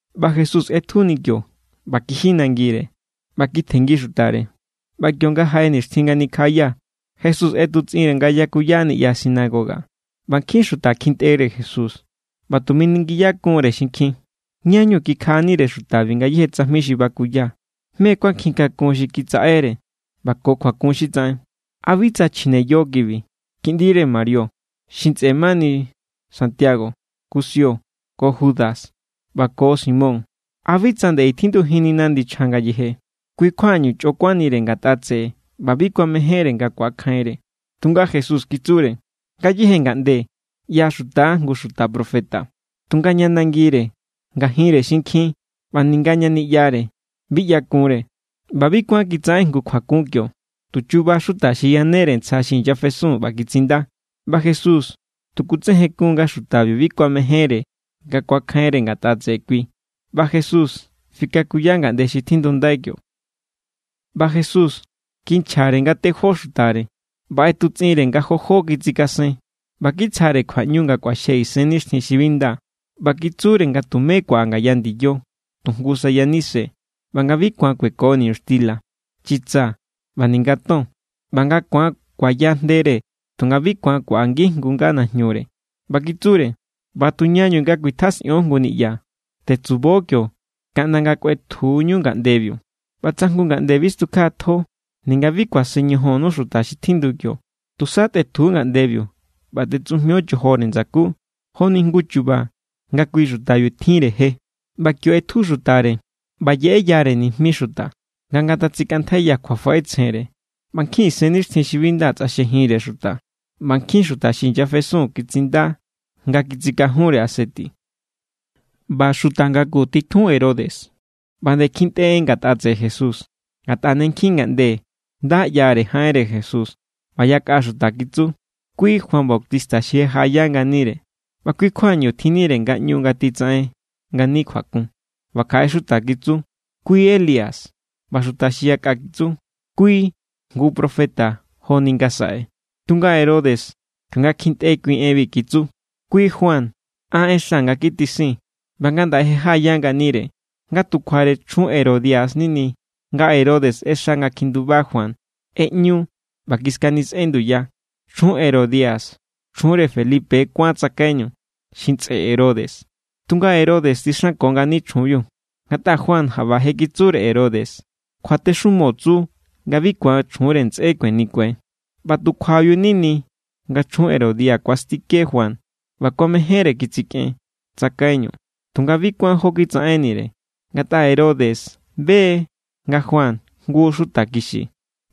ꞌBa Jesús ꞌetjuni kio ꞌba kiji nangire, ꞌba kitjenngi xutare. ꞌBa kionga jaꞌe nixtjin nga nikjaꞌaya, Jesús ꞌetutsꞌinre nga yakuya niꞌya sinagoga. ꞌBa nkjin xuta kjintꞌere Jesús, ꞌba tu miningiyakun=re xinkjin: —¿Ñáñu kikjaꞌanire xutabi ngayéje tsajmi xi bakuya? ¿Mé= kjuankjinkakun xi kitsaꞌere, ꞌba ko kjuakun xi tsaꞌen? ¿A bi tsa chjine yo kibi, kiꞌndire Marío, xi ntsꞌe mani Sandio, Kusio, ko Judo, ꞌba ko Simón? ¿A bi tsa nde i tjindujinnina ndichja ngayeje? Kui= kjuañu chꞌo kuánnire ngatꞌa tseꞌe ꞌba bi kuamejénre nga ku̱akjainre. Tunga Jesús kitsure: —Ngayéje ngaꞌnde ꞌyaxuta= jngu xuta profeta, tunga ña nangire, ngajinre xinkjin ꞌba ninga ña niꞌyare bi ꞌyakunre. ꞌBa bi kuán kitsaꞌen jngu kjuakun kio, tu chuba xuta xi yanere ntsja xi inyafesun ꞌba kitsinda. ꞌBa Jesús tu kutsejenkuun nga xutabiu bi kuamejénre nga kuakjainre ngatꞌa tseꞌe kui. ꞌBa Jesús fikakuya ngaꞌnde xi tjindundai kio. ꞌBa Jesús kinchjare nga tejó xutare, ꞌba ꞌetutsꞌinre nga jo jó kitsikasen, ꞌba kitsjare kjuaꞌñu nga kꞌuaxje isennixtjin xi bi nda. ꞌBa kitsure nga tumé kuaꞌa ngaya ndiyo, tu jngu sa yanise. ꞌBa nga bi ku̱an kueko niñuxtila, chitsa, ꞌba ninga ton. ꞌBa nga ku̱an kuaya jndere, tunga bi ku̱an kuaꞌa ngijngu nga najñure. ꞌBa kitsure: —ꞌBa tuñañu nga kuitjasꞌion jngu niꞌya, tetsubo kio kaꞌnda nga̱ kꞌuetjuñu ngaꞌndebiu. ꞌBa tsa jngu ngaꞌnde bi stukjaꞌatjo ninga bi kuasen ñojonnu xuta xi tjindu kio, tusa tꞌetju ngaꞌndebiu ꞌba tꞌetsujmio chojore ndsakú, joni jngu chu̱ba̱ nga kui xutabiu tjinre je. ꞌBa kio ꞌetju xutare, ꞌba yeꞌeyare nijmi xuta nga ngatatsikꞌantjaiya kjuafaꞌetsjenre. ꞌBa nkjin isennixtjin xi bi nda tsꞌaxjejinre xuta, ꞌba nkjin xuta xi inyafesun kitsinda nga kitsikajunre aseti. ꞌBa xuta ngaku xi titjun Herodes ꞌba nde kjintꞌe en ngatꞌa tseꞌe Jesús, ngatꞌa ne nkjin ngaꞌnde nda ꞌyare jaꞌenre Jesús. ꞌBa yakꞌa xuta kitsu: —Kui Juan Bautista xi je jaꞌaya nganire, ꞌba kui= kjuañu tjinnire ngaꞌñu nga titsaꞌen ngani kjuakun. ꞌBa kjaꞌe xuta kitsu: —Kui Elías. ꞌBa xuta xi yakꞌa kitsu: —Kui jngu xuta profeta joni ngasaꞌe. Tunga Herodes, kionga kjintꞌe kui enbi, kitsu: —Kui Juan. An ꞌexa nga kitisin, ꞌba ngandaꞌe je jaꞌaya nganire. Nga tu kjuare chjun Herodia= nini, nga Herodes ꞌexa nga kjinduba Juan, ꞌeꞌñu, ꞌba kiskanisꞌen nduya. Chjun Herodia, chjunre Felipe kuán tsakaiñu, xi ntsꞌe Herodes, tunga Herodes tsixanko ngani chjunbiu. Ngatꞌa Juan jaꞌba je kitsure Herodes: —Kjuatexumo tsu nga bi ku̱an chjunre ntsꞌé kuenikue. ꞌBa tu kjuabiu= nini nga chjun Herodia kuastike Juan ꞌba kuamejénre kitsikꞌen tsakaiñu, tunga bi kuán jó kitsaꞌennire; ngatꞌa Herodes be= nga Juan jngu xuta kixi,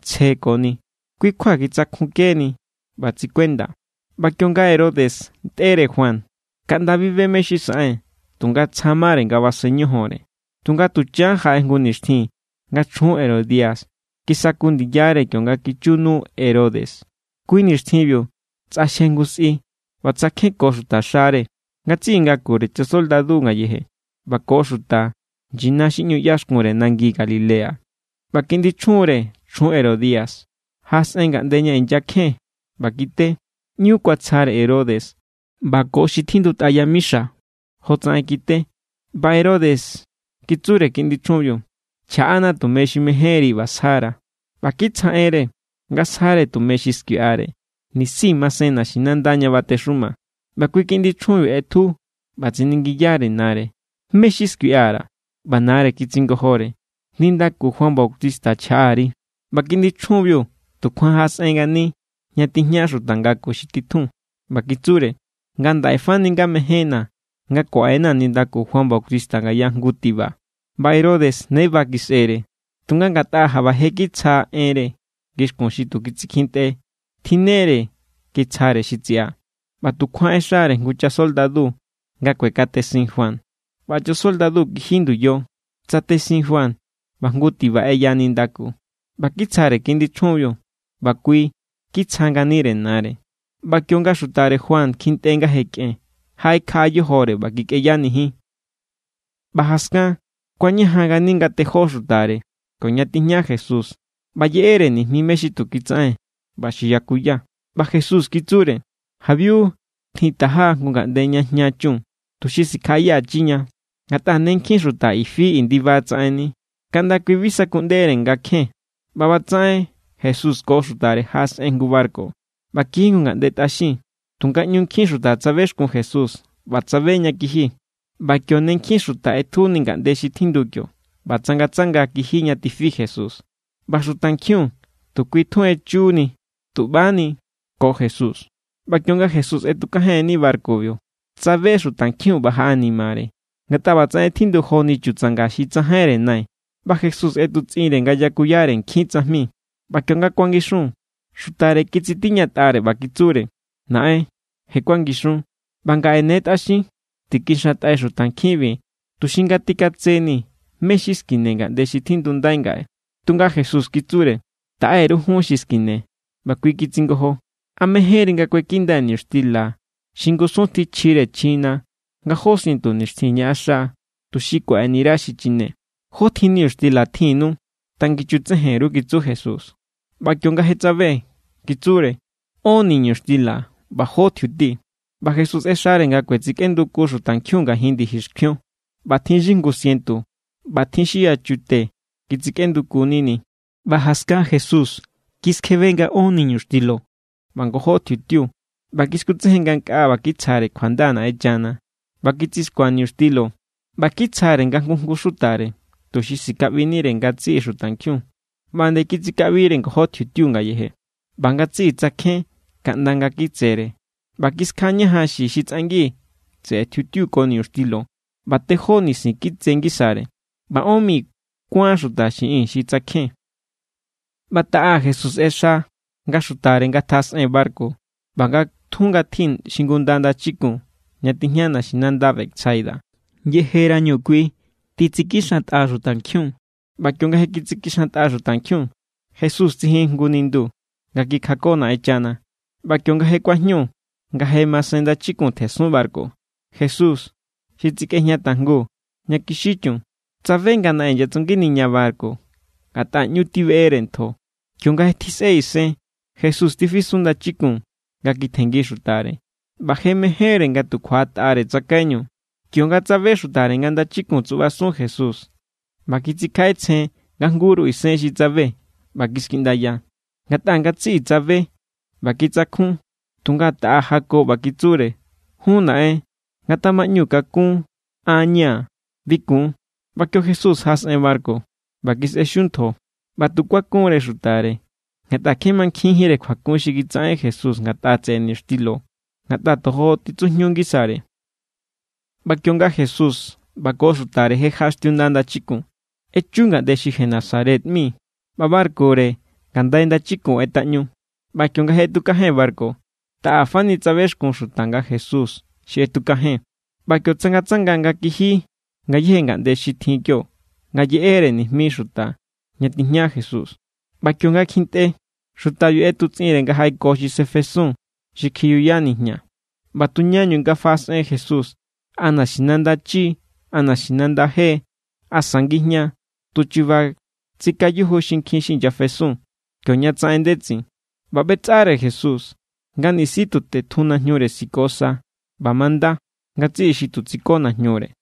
tsje ko ni. Kui= kjua kitsakjunkeni ꞌba tsikuenda. ꞌBa kionga Herodes ntꞌere Juan, kaꞌnda bi be mé= xi saꞌen, tunga tsja mare nga basen ñojonre. Tunga tuchan jaꞌe nixtjin nga chjun Herodia kisaku ndiyare kionga kichu nu Herodes. Kui= nixtjinbiu tsꞌaxje jngu sꞌi ꞌba tsakjenko xutaxare ngatsiꞌi ngakure chasoldadu ngayeje ꞌba ko xuta nyina xi ꞌñu ꞌyaxkunre nangi Galilea. ꞌBa kiꞌndi chjunre chjun Herodia jaꞌasꞌen ngaꞌnde ña inyakjen ꞌba kite. ꞌÑu kuatsjare Herodes ꞌba ko xi tjindutꞌa yamixo jotsaꞌen kite. ꞌBa Herodes kitsure kiꞌndi chjunbiu: —Chjaꞌana tume xi mejénri, ꞌba sjara̱. ꞌBa kitsjaꞌenre nga sjare tume xi skuiꞌare, nisi masen naxinanda ña batexuma. ꞌBa kui kiꞌndi chjunbiu ꞌetju, ꞌba tsiningiyare nare: —¿Mé= xi skuiꞌa_ra̱? ꞌBa nare kitsingojore: —Nindaku Juan Bautista chjaꞌa_ri. ꞌBa kiꞌndi chjunbiu tukjuan jaꞌasꞌen ngani ña tijña xuta ngaku xi titjun, ꞌba kitsure: —Ngandaꞌe fani nga mejénna̱ nga kuaꞌenaa̱ nindaku Juan Bautista ngaya jngu tiba. ꞌBa Herodes ne ba kisꞌere; tunga ngatꞌa jaꞌba je kitsja enre ngixkun xi tu kitsikjintꞌe, tjinnere kitsjare xi tsiꞌa. ꞌBa tukjuan ꞌexare jngu chasoldadu nga kuekatesin Juan. ꞌBa chasoldadu kiji nduyo, tsatesin Juan, ꞌba jngu tiba ꞌeya nindaku. ꞌBa kitsjare kiꞌndi chjunbiu, ꞌba kui kitsja nganire nare. ꞌBa kionga xutare Juan kjintꞌe nga je kꞌen, jaꞌekjaꞌa yojore ꞌba kikꞌeyanijin. ꞌBa jaskan, kuañajan ngani nga tejó xutare kioña tijña Jesús ꞌba yeꞌere nijmi mé= xi tu kitsaꞌen, ꞌba xi yakuya. ꞌBa Jesús kitsure: —Jabiu, tjintaja jngu ngaꞌnde ña jña chun, tuxi sikjaꞌayachiña. Ngatꞌa ne nkjin xuta i fi i ndiba tsaꞌenni, kaꞌnda kui bi sakuꞌndere nga kjen. ꞌBa ꞌbatsaꞌen Jesús ko xutare jaꞌasꞌen jngu barku ꞌba kiji jngu ngaꞌnde tꞌaxin. Tunga ꞌñu nkjin xuta tsabexkun Jesús, ꞌba tsabe ña kiji. ꞌBa kio ne nkjin xuta ꞌetjuni ngaꞌnde xi tjindu kio, ꞌba tsangatsanga kiji ña tifi Jesús. ꞌBa xutankjiun tu kui tjun echuni tuꞌbani ko Jesús. ꞌBa kionga Jesús ꞌetukajenni barkubiu, tsabe xutankjiun ꞌba jaꞌanimare, ngatꞌa ꞌba tsaꞌen tjindu joni chutsanga xi tsajainjínre nai. ꞌBa Jesús ꞌetutsꞌinre nga yakuyare nkjin tsajmi. ꞌBa kionga kuangixun, xutare kitsitiñatꞌare ꞌba kitsure: —Naꞌen, je kuangixun, ꞌba ngaꞌe ne tꞌaxin. Tikaxantꞌai xutankjinbi, tuxi ngatjikatseni mé= xi skine ngaꞌnde xi tjindundai ngaꞌe. Tunga Jesús kitsure: —Taꞌe_ru jun xi skine. ꞌBa kui kitsingojo: —¿A mejénri nga kuekindai niñuxtila xi ngusun tjin chjire chjina nga jó sientu nixtjin ñaꞌaxa, tuxi kuaꞌeni_ra xi chine? —¿Jótjin niñuxtila tjinnu? Tangichutsejen_ru —kitsu Jesús. ꞌBa kionga je tsabe, kitsure: —Ón niñuxtila ꞌba jó tjiuti. ꞌBa Jesús ꞌexare nga kuetsikꞌenduku xutankjiun ngajin ndiji xkjuion; ꞌba tjin xi jngu sientu ꞌba tjin xi yachute kitsikꞌenduku nini. ꞌBa jaskan Jesús kiskjebe nga ón niñuxtilo ꞌba ngojó tjiutiu. ꞌBa kiskutsejen ngankꞌaa ꞌba kitsjare kjuanda Naꞌenchana, ꞌba kitsixkua niñuxtilo ꞌba kitsjare nga jngu jngu xutare, tuxi sikaꞌbinire ngatsiꞌi xutankjiun. ꞌBa nde kitsikaꞌbire ngojó tjiutiu ngayeje. ꞌBa ngatsiꞌi tsakjen kaꞌnda nga̱ kitsere; ꞌba kiskjaꞌañajan xie xi tsꞌangi tseꞌe tjiutiu ko niñuxtilo ꞌba tejó nisin kitse ngisare. ꞌBa ón mi kuán xuta xiꞌin xi tsakjen. ꞌBa taꞌa, Jesús ꞌexa nga xutare ngatjaꞌasꞌen barku ꞌba nga tjun ngatji xingunda ndachikun ña tijña naxinanda Betsaida, yejerañu kui titsikixantꞌa xutankjiun. ꞌBa kionga je kitsikixantꞌa xutankjiun, Jesús tsijin jngu nindu nga kikjako Naꞌenchana. ꞌBa kionga je kuajñu, nga je masen ndachikun tjensun barku, Jesús, xi tsikꞌejña tajngu ña kixi chun, tsabe nga naꞌen inyatsunginiña barku, ngatꞌa ꞌñu tibeꞌere ntjo. Kionga je tjisꞌe isen, Jesús tifisun ndachikun nga kitjenngi xutare. ꞌBa je mejénre nga tu kjuaꞌatꞌare tsakaiñu, kionga tsabe xutare nga ndachikun tsuꞌbasun Jesús. ꞌBa kitsikjaꞌetsjen nga jngu=ru isen xi tsabe ꞌba kiskiꞌndaya; ngatꞌa ngatsiꞌi tsabe ꞌba kitsakjun. Tunga taꞌa jako ꞌba kitsure: —¡Jún, naꞌen, ngatamaꞌñu kakún; an= ña̱, bi kun! ꞌBa kio Jesús jaꞌasꞌen barku, ꞌba kisꞌe xiu ntjo. ꞌBa tu kuakunre xutare ngatꞌa kje mankjinjínre kjuakun xi kitsaꞌen Jesús ngatꞌa tseꞌe niñuxtilo, ngatꞌa tojo titsujñu ngisare. ꞌBa kionga Jesús ꞌba ko xutare je jaꞌaxtiunda ndachikun, echu ngaꞌnde xi Genesaret ꞌmi, ꞌba barkure ngandai ndachikun ꞌetꞌaꞌñu. ꞌBa kionga je ꞌetukajen barku, taꞌa fani tsabexkun xuta nga Jesús= xi ꞌetukajen. ꞌBa kio tsangatsanga nga kiji ngayéje ngaꞌnde xi tjin kionga yeꞌere nijmi xuta ña tijña Jesús. ꞌBa kionga kjintꞌe, xutabiu ꞌetutsꞌinre nga jaꞌeko xi sefesun xi kjiyuya nijña. ꞌBa tu ñañu nga faꞌasꞌen Jesús, a naxinanda chi=, a naxinanda je= asa ngijña=, tuchuba tsikayuju xinkjin xi inyafesun kioña tsaꞌen ndetsin. ꞌBa ꞌbetsꞌare Jesús nga nisi tu tetjun najñure siko sa; ꞌba manda ngatsiꞌi xi tu tsiko najñure.